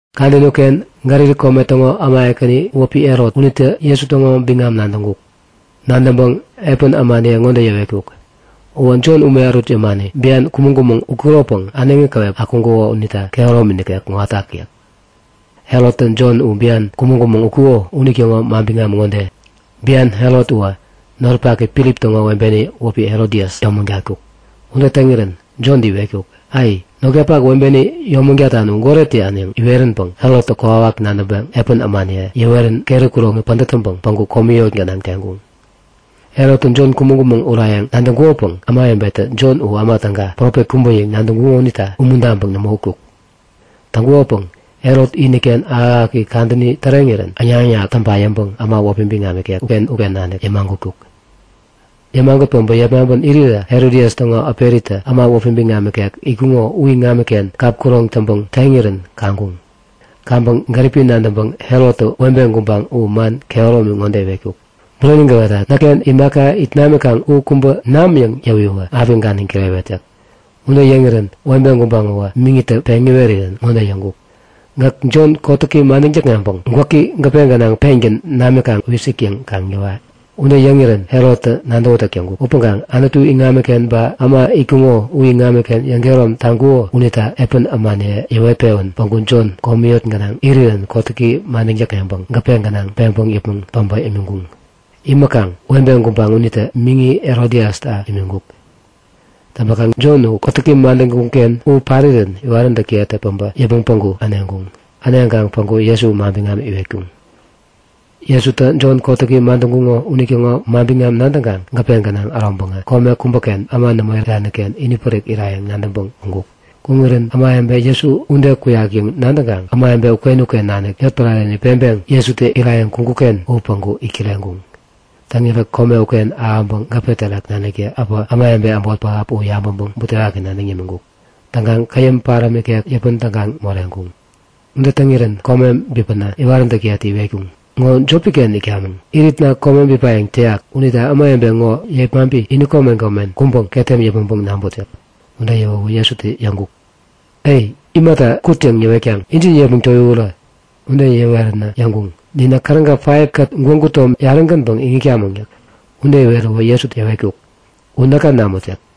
Kadäni uken Galili kome täŋo äma ekäni wäpi Herot unitä Jesu täŋo biŋam nadäŋkuk. Nadäŋpäŋ epän ämaniye ŋode yäwetkuk; Uwä Jon ume ärut yämani bian kumäŋ-kumäŋ utkuropäŋ äneŋi käwep akuŋkuko unita kehäromi nikek kuŋatak yäk. Herottä Jon u bian kumäŋ-kumäŋ utkuko unitäŋo manbiŋam ŋode; Bian Herot uwä noripaki Filip täŋo webeni wäpi Herodias yomägatkuk. Ude täŋirän Jontä iwetkuk; Ai! Notkapak webeni yomägatan u goret täyan yäŋ iweränpäŋ Herottä kokwawak nadäŋpäŋ epän ämaniye yäwerän keri kuroŋi pädät täŋpäŋ päŋku komi yot gänaŋ teŋkuŋ. Herottä Jon kumäŋ-kumäŋ urayäŋ nadäŋkukopäŋ ämawebetä Jon u äma täga, profet kubä yäŋ nadäŋkuŋo unita umuntaŋpäŋ nämo utkuk. Täŋkukopäŋ Herot iniken ahäk-ahäk kadäni täŋirän äŋnak-äŋnak täŋpa yäŋpäŋ äma wäpi biŋam ikek uken-uken nanik yämagutkuk. Yämagut päbä yepmaŋpän irirä Herodias täŋo äperitä äma wäpi biŋam ikek itkuŋo u iŋamiken kap, kuroŋ täŋpäŋ teŋirän kaŋkuŋ. Kaŋpäŋ gäripi nadäŋpäŋ Herottä webe gubaŋ u man kehäromi ŋode iwetkuk; Bureni gäwetat. Näkken imaka it namikaŋ u kubä nam yäŋ yäwiwä api ganiŋ kirewet yäk. Ude yäŋirän webe gubaŋ uwä miŋitä peŋ iwerirän ŋode yäŋkuk; Gäk Jon kotäki madäŋ täkŋeŋpäŋ gwäki gäpe gänaŋ peŋkaŋ pengän namikaŋ wisik yäŋ kaŋ yäwa! yäk. Ude yäŋirän Herottä nadäwätäk täŋkuk. Upäŋkaŋ Anutu iŋamiken ba äma itkuŋo u iŋamiken yäŋkehärom taŋkuko unita epän ämaniye yäwet-pewän päŋku Jon komi yot gänaŋ irirän kotäki madäŋ täkŋeŋpäŋ gäpe gänaŋ peŋpäŋ yäpmäŋ päbä imiŋkuŋ. Imäkaŋ webe gubaŋ unitä miŋi Herodiasta imiŋkuk. Täŋpäkaŋ Jon u kotäki madäŋkuŋ-ken u parirän iwaräntäkiyetä päbä yäpmäŋ päŋku äneŋkuŋ. Äneŋkaŋ päŋku Jesu manbiŋam iwetkuŋ. Jesutä Jon kotäki madäŋkuŋo unitäŋo manbiŋam nadäŋkaŋ gäpe gänaŋ äroŋpäŋä kome kubäken äma nämo irani-ken inipärik irayäŋ nadäŋpäŋ kuŋkuk. Kuŋirän ämawebe Jesu ude kuk yäŋ nadäŋkaŋ ämawebe uken-uken nanik yotpärareni peŋpeŋ Jesutä irayäŋ kuŋkuk-ken u päŋku it kireŋkuŋ. Täŋirä kome uken ahäŋpäŋ gäpe terak naniktä äpä ämawebe äbot pähap u yabäŋpäŋ butewaki nadäŋ yämiŋkuk. Täŋkaŋ käyäm paräm ikek yäpän tägaŋ moreŋkuŋ. Ude täŋ irirän kome bipänä iwaräntäkiyetä iwetkuŋ; Ŋo jopi-ken itkamäŋ. Iritna kome bipayäŋ täyak. Unita ämawebe ŋo yepmaŋpi ini komen komen kuŋpäŋ ketem yäpmäŋpäŋ naŋput yäk. Ude yäwäwä Jesutä yäŋkuk; A! Imata kut yäŋ yäwetkaŋ? Injin yepmäŋ towiwurä! Ude yäweränä yäŋkuŋ; Ninä käräga 5kät gwägu tom yarä-gänpäŋ iŋitkamäŋ yäk. Ude iweräwä Jesutä yäwetkuk; U näka namut yäk.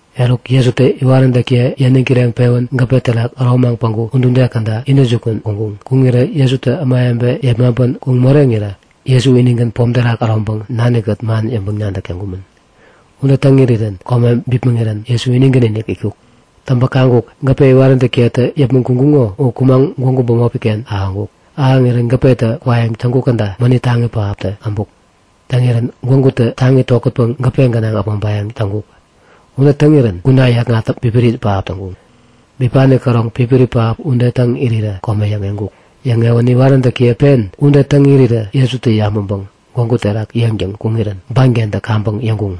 Eruk, Jesutä iwaräntäkiye yäniŋ kireŋpewän gäpe terak äromaŋ gwägu udude käda intäjukun kuŋkuŋ. Kuŋirä Jesutä ämawebe yepmaŋpän kuŋ moreŋirä Jesu inigän pom terak äroŋpäŋ nani-kät man yäŋpäŋ-nadäk täŋkumän. Ude täŋ irirän kome bipmäŋirän Jesu inigän-inik itkuk. Täŋpäŋ kaŋkuk; Gäpe iwaräntäkiyetä yäpmäŋ kuŋkuŋo u kumaŋ gwägu bämopi-ken ahäŋkuk. Ahäŋirän gäpetä kwayäŋ täŋkuk käda mänit taŋi pähaptä äbuk. Täŋirän gwägutä taŋi tokätpäŋ gäpe gänaŋ äpmoŋpayäŋ täŋkuk. Ude täŋirän kuna yäkŋat pipiri pähap täŋkuŋ. Bipani käroŋ pipiri pähap ude täŋ irirä kome yäŋeŋkuk. Yäŋewänä iwaräntäkiye pen ude täŋ irirä Jesutä yabäŋpäŋ gwägu terak yeŋtäŋ kuŋirän bankentä kaŋpäŋ yäŋkuŋ;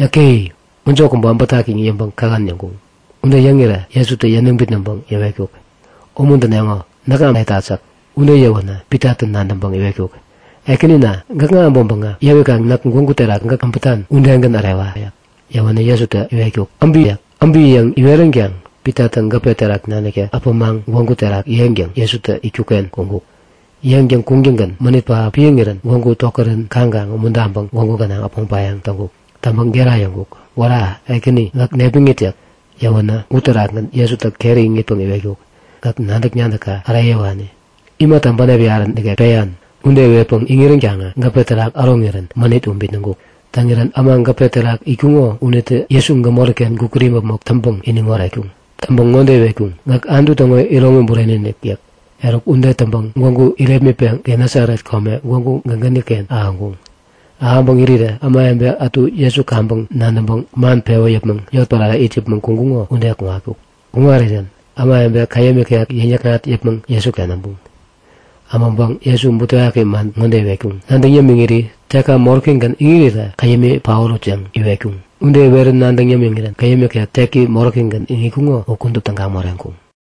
Yäke-e! Mäjo kubä äbätak! yäŋ yäŋpäŋ kähän yäŋkuŋ. Ude yäŋirä Jesutä yäniŋ bitnäŋpäŋ yäwetkuk; Umuntäneŋo. Näkŋa äretat yäk. Ude yäwänä Pitatä nadäŋpäŋ iwetkuk; Ekänina! Gäkŋa äbäŋpäŋä yäwikaŋ näk gwägu terak gäkä äbätan udegän ärewa! yäk. Yäwänä Jesutä iwetkuk; Äbiwä! yäk. Äbi yäŋ iweränkaŋ Pitatä gäpe terak naniktä äpämaŋ gwägu terak yeŋtäŋ Jesutä itkuk-ken kuŋkuk. Yeŋtäŋ kuŋtäŋgän mänit pähap piäŋirän gwägu tokärän kaŋkaŋ umuntaŋpäŋ gwägu gänaŋ äpmoŋpayäŋ täŋkuk. Täŋpäŋ gera yäŋkuk; Wära! Ekäni gäk nepmäŋit yäk. Yäwänä uterakgän Jesutä keri iŋitpäŋ iwetkuk; Gäk nadäk-nadäkka äreyäwani! Imata bänep yarä nikek peyan? Ude iwetpäŋ iŋiränkaŋä gäpe terak äroŋirän mänit u bitnäŋkuk. Täŋirän äma gäpe terak itkuŋo unitä Jesu gämori-ken gukut imäpmok täŋpäŋ iniŋ oretkuŋ. Täŋpäŋ ŋode iwetkuŋ; Gäk Anutu täŋo iroŋi bureni-inik! yäk. Eruk ude täŋpäŋ gwägu irepmitpäŋ Genesaret kome gwägu gägäni-ken ahäŋkuŋ. Ahäŋpäŋ irirä ämawebe ätu Jesu kaŋpäŋ nadäŋpäŋ man pewä yäpmäŋ yotpärare it yäpmäŋ kuŋkuŋo ude kuŋatkuk. Kuŋarirän ämawebe käyäm ikek yäŋ-yäkŋat yäpmäŋ Jesuken äbuŋ. Äbäŋpäŋ Jesu butewaki man ŋode iwetkuŋ; Nadäŋ yämiŋiri tekka moräkigän iŋirirä käyämi paorut yäŋ iwetkuŋ. Ude iwerä nadäŋ yämiŋirän käyäm ikek teki moräkigän iŋitkuŋo u kudup tägaŋ moreŋkuŋ.